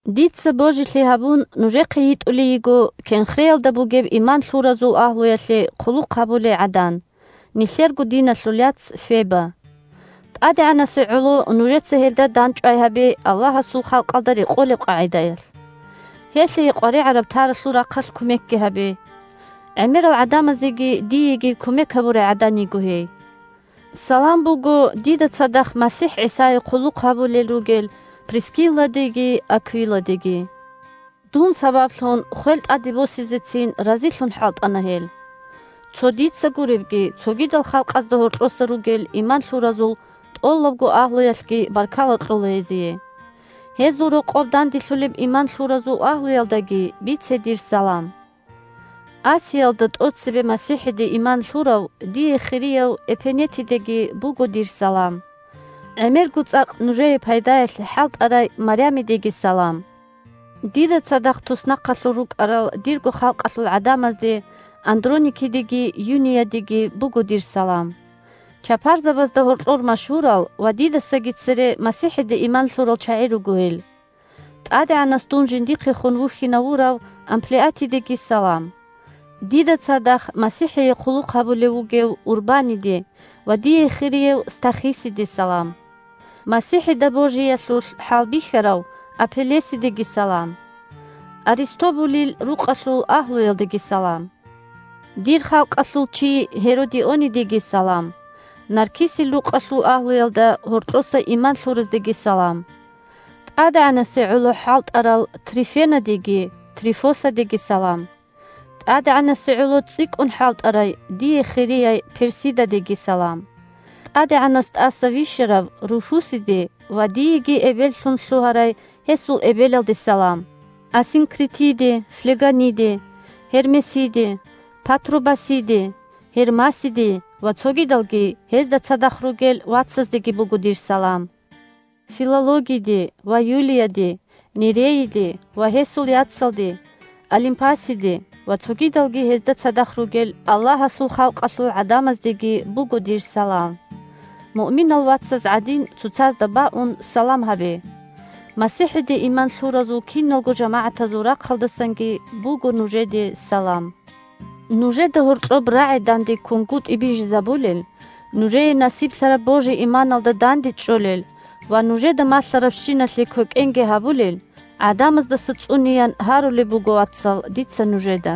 Дица, божилъи гьабун, нужехъе йитӀулей йиго Кенхреялда бугеб иман лъуразул агьлуялъе хъулухъ гьабулей гӀадан, нилъерго диналъул яц Феба. ТӀадегӀанасе гӀоло нужеца гьелда дандчӀвай гьабе Аллагьасул халкъалда рекъолеб къагӀидаялъ. Гьелъие къваригӀараб-таралъул рахъалъ кумекги гьабе. ГӀемерал гӀадамазеги диеги кумек гьабурай гӀадан йиго гьей. Салам буго дида цадахъ МасихӀ ГӀисае хъулухъ гьабулел ругел Прискилладеги Аквиладеги. Дун сабаблъун хвел тӀаде босизегицин разилъун хӀалтӀана гьел. Цо дица гуребги, цогидал халкъазда гьоркьоса ругел иман лъуразул тӀолабго агьлуялъги баркала кьола гьезие. Гьезул рокъоб данделъулеб иман лъуразул агьлуялдаги бице дир салам. Асиялда тӀоцебе МасихӀиде иман лъурав, дие хирияв Эпенетидеги буго дир салам. ГӀемерго цӀакъ нужее пайдаялъе хӀалтӀарай Марямидеги салам. Дида цадахъ туснахъалъур рукӀарал дирго халкъалъул гӀадамазде – Андроникидеги Юниядеги буго дир салам. Чапарзабазда гьоркьор машгьурал ва дидасаги цере МасихӀиде иман лъурал чагӀи руго гьел. ТӀадегӀанас дун жиндехун вухьинавурав Амплиатидеги салам. Дида цадахъ МасихӀие хъулухъ гьабулев вугев Урбаниде ва дие хирияв Стахисиде салам. МасихӀида божиялъулъ хӀалбихьарав Апеллесидеги салам. Аристобулил рукъалъул агьлуялдеги салам. Дир халкъалъул чи Гьеродионидеги салам. Наркисил рукъалъул агьлуялда гьоркьоса иман лъураздеги салам. ТӀадегӀанасе гӀоло хӀалтӀарал Трифенадеги Трифосадеги салам. ТӀадегӀанасе гӀоло цӀикӀкӀун хӀалтӀарай, дие хирияй Персидадеги салам. ТӀадегӀанас тӀаса вищарав Руфусиде ва диеги эбеллъун лъугьарай гьесул эбелалде салам. Асинкритиде, Флегониде, Гьермесиде, Патробасиде, Гьермасиде ва цогидалги гьезда цадахъ ругел вацаздеги буго дир салам. Филологиде ва Юлияде, Нерейиде ва гьесул яцалде, Олимпасиде ва цогидалги гьезда цадахъ ругел Аллагьасул халкъалъул гӀадамаздеги буго дир салам. Муъминал вацаз гӀадин, цоцазда баун, салам гьабе. МасихӀиде иман лъуразул киналго жамагӀатазул рахъалдасанги буго нужеде салам. Нужеда гьоркьоб рагӀи дандеккунгутӀи бижизабулел, нужее насиблъараб божи-иманалда дандечӀолел ва нужеда малъарабщиналъе квекӀенги гьабулел гӀадамаздаса цӀунеян гьарулеб буго, вацал, дица нужеда.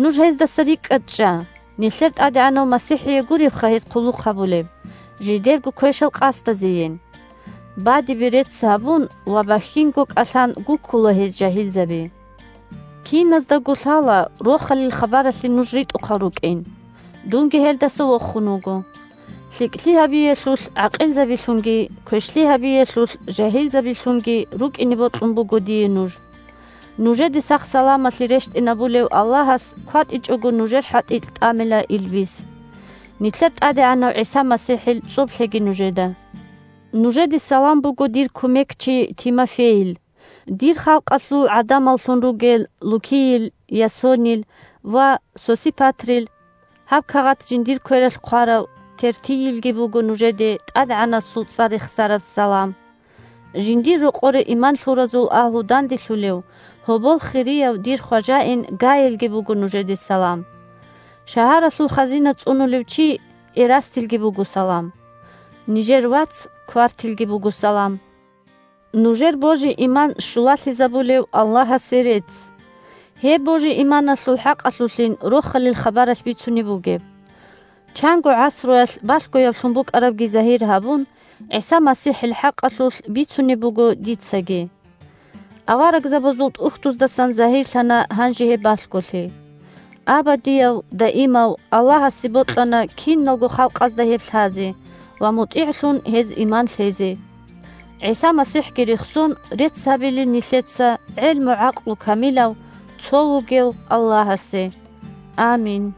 Нуж гьездаса рикӀкӀад чӀа. Нилъер ТӀадегӀанав МасихӀие гуребха гьез хъулухъ гьабулеб, жидерго квешал къасдазейин. Бадибе рецц гьабун ва бахьинго кӀалъан гуккула гьез жагьилзаби. Киназдаго лъала Рохалил хабаралъе нуж ритӀухъал рукӀин. Дунги гьелдаса вохун вуго. ЛъикӀлъи гьабиялъулъ гӀакъилзабилъунги, квешлъи гьабиялъулъ жагьилзабилъунги рукӀине бокьун буго дие нуж. Нужеде сах-саламалъи рещтӀинабулев Аллагьас кватӀичӀого нужер хӀатӀикь тӀамила илбис. Нилъер ТӀадегӀанав ГӀиса МасихӀил цӀоб лъеги нужеда. Нужеде салам буго дир кумекчи Тимофейил, дир халкъалъул гӀадамаллъун ругел Лукийил, Ясонил ва Сосипатрил. Гьаб кагъат жиндир квералъ хъварав Тертийилги буго нужеде ТӀадегӀанасул цӀар рехсараб салам. Жиндир рокъоре иман лъуразул агьлу данделъулев, гьобол хирияв дир хважаин Гайилги буго нужеде салам. Шагьаралъул хазина цӀунулев чи Эрастилги буго салам. Нижер вац Квартилги буго салам. Нужер божи-иман щулалъизабулев Аллагьасе рецц. Гьеб божи-иманалъул хӀакъалъулъин Рохалил хабаралъ бицунеб бугеб. Чанго гӀасруялъ балъгояблъун букӀарабги загьир гьабун, ГӀиса МасихӀил хӀакъалъулъ бицунеб буго дицаги. Аварагзабазул ТӀухьдуздасан загьирлъана гьанже гьеб балъголъи. Абадияв-даимав Аллагьасе бокьана киналго халкъазда гьеб лъазе ва мутӀигӀлъун гьез иман лъезе. ГӀиса МасихӀги рехсон, рецц гьабилин нилъеца гӀелму-гӀакълу камилав цо вугев Аллагьасе! Амин.